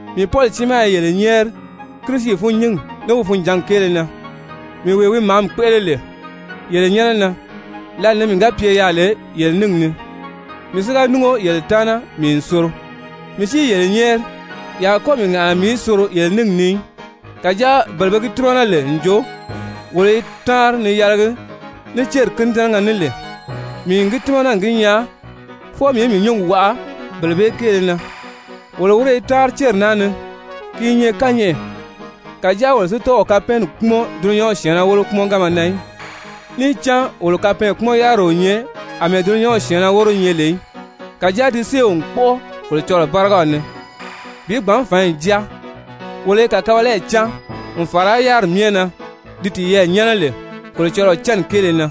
Mii Pɔli tiimaa i yele nyɛ́ɛri Kirisi fûnnyingi ní wi funjǎngi kéele na, mii wee wi màámi kpéʔele lè yele nyɛ́nɛ na lǎlee ni mii ga pye yaà lè yele níngi ni, mii si ga núngo yele taana, mii n soro. Mii si i yele nyɛ́ɛri, ye a kɔ́ mii ŋàʔana mii í soro yele níngi ni í, kàjáa bele be gi tímana lè n jo wolo i táanri ni yɛlɛgi ní céri kínidɛnɛgɛ ní lè, mii n gi tímana n gi nyaa fwɔɔ mii í mii nyúngi waʔa bele bee kéele na. Wolo wíre i táanri céri naa ni, ki i nyɛ kányɛʔɛ, kàjáa wolo si tɔ́ɔ o kapɛɛnni kpúmɔn dulunyanw syɛ̀ɛnnɛ wólo kpúmɔnganma na í. Níì cán wolo kapɛɛnkpumɔn-yáriri o nyɛ àmɛɛ dulunyanw syɛ̀ɛnnɛ wóro nyɛ lè í, kàjáa ti séew n kpɔ́ʔɔ Kolocɔlɔɔ bárigaw ni bi gbǎn fǎnyi jáa. Wolo i kàkabalayi cáan, n fàra yáriri myɛ na di tiyɛɛ nyɛ́nɛ lè Kolocɔlɔɔ cánni kéele na,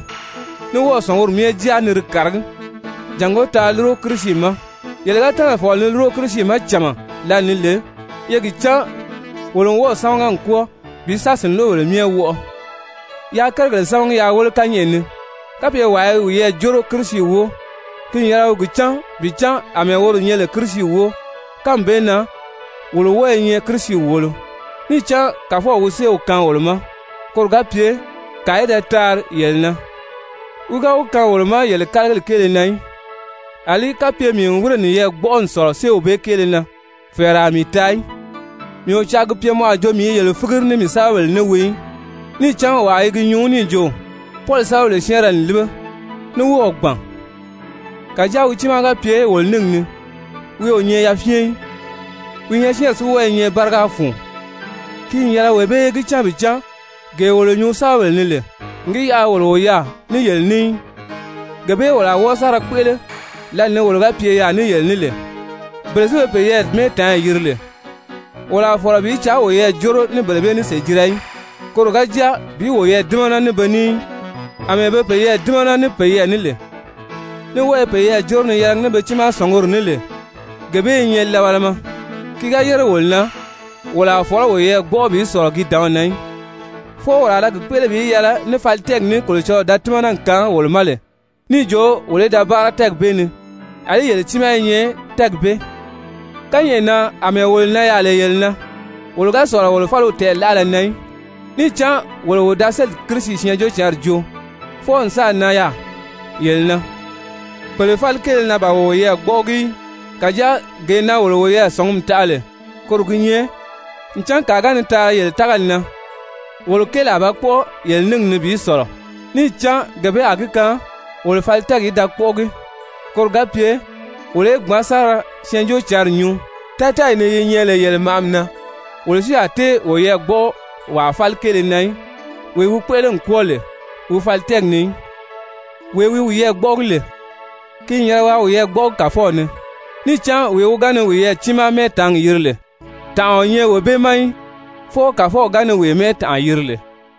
ní wɔ́ɔ̀ sɔ̀nguri myɛ jáa ni di kàragí jàngó taa lúro Kirisi ma. Yele ga tɛ́nɛ̀ fɔ̀lɔ ni lúro Kirisi ma cama lǎli ni lè, ye gi cán wolo n wɔ́ɔ̀ sámaga n kwɔ́ɔ bi sa sìnloʔobèle myɛ wɔʔɔ. Yaa kérigèle sámagi yaa wéle kányɛʔɛ ni! Kapye wàa i wiyɛɛ jóro Kirisi wóo, ki n yɛlɛ wi gi cán bi cán àmɛɛ woro nyɛ lè Kirisi wóo, kánmi bee na wolo wɔ́ɔ̄ nyɛ Kirisi wòolo. Níì cán Kàfɔw wi séew kaan wolo ma, koro ga pye kàa í da taari yele na, wi ga wi kaan wolo ma yele kálagili kéele na í, àlí kapye mii n wírè niyɛɛ gbɔ́ʔɔ n sɔ̀lɔ séew bee kéele na, fɛ̀ɛrɛ a mii taa í. Mii o caa gi pye mɔ a jo mii i yele fígiri ní mii sɛ́bɛbèle ní wii í. Níì cán wàa i gi nyuu níì jo: «Pɔli sɛ́bɛbèle syɛ́ɛnrɛ n líbe, ní wɔ́ɔ̀ gbàn. Kàjáa wi tiimaa ga pye wolo níngi ni, wi o nyɛ yafyɛn í, wi nyɔɔsyɛɛnri si wɔ́ɔ i nyɛ báriga fun.» Ki n yɛlɛ wee bee í gi cán bi cán, gee wolo nyuu sɛ́bɛbèle ni lè n gi yaʔa wolo o yaà ní yele ní í, gee bee wolo a wɔ́ɔ sa ra kpéʔele lǎli ni wolo ga pye yaà ní yele ní lè. Bele si be peyɛɛ mɛ́ɛtaanyi yiri lè, wolo a fɔ̀lɔ bi caa woyɛɛ jóro ní bele bee ní sèjira í, koro ga jáa bi woyɛɛ dímana ní be ní í. Amɛɛ be peyɛɛ dímana ní peyɛɛ ní lè, ní wɔ́ɔ i peyɛɛ jóro ni yɛlɛgi ní be tiimaa sɔ̀nguri ní lè, gee bee i nyɛ labalama. Ki ga yére wolo na, wolo a fɔ̀lɔ́ woyɛɛ gbɔ́ʔɔ bi sɔ̀lɔ ki dǎnw na í, fwɔɔ wolo a ra gi kpéʔele bi yɛlɛ ní fali tɛ́ɛgi ní Kolocɔlɔɔ da tímana n kaan wolo ma lè níì jo wolo í da báara tɛ́ɛgi bee ni, àlí yele tiimaa i nyɛ tɛ́ɛgi bee ni. Kányɛʔɛ na àmɛɛ wolo nan yaà lè yele na, wolo ga sɔ̀lɔ wolo fáliw tɛɛ̀laʔala na í. Níì cán wolo wo da sélì Kirisi Syɛɛnjóocǎnri joo fwɔɔ n sáà nan yaà yele na. Pèle fáli kéele na ban wolo woyɛɛ gbɔ́ʔɔgi í. Kàjáa gee na wolo wo sɔ̀ngumi taʔa lè koro gi nyɛ ncan kàa ga ni taari yele tágali na, wolo kéeli a ba kpɔ́ʔɔ yele níngi ni bi sɔ̀lɔ, níì cán gee bee a gi kaan wolo fali tɛ́ɛgi í da kpɔ́ʔɔgi, koro ga pye wolo í gbǎn sa ra Syɛɛnjóocǎnri nyuu tátɛɛyi ni yi nyɛ lè yele màʔami na, wolo si a tée woyɛɛ gbɔ́ʔɔ wàa fáli kéele na í, wee wi kpéʔele n kwɔ́ɔ lè wi fali tɛ́ɛgi ni í. «Wee wi wiyɛɛ gbɔ́ʔɔgi lè, ki n yɛlɛ waa wiyɛɛ gbɔ́ʔɔgi Kàfɔw ni.» Níì cán wee wi ga ni wiyɛɛ tiimaa mɛ́ɛtaangi yiri lè, tànʔa o nyɛ wee bee ma í, fwɔɔ Kàfɔw ga ni wee mɛ́ɛtanʔa yiri lè.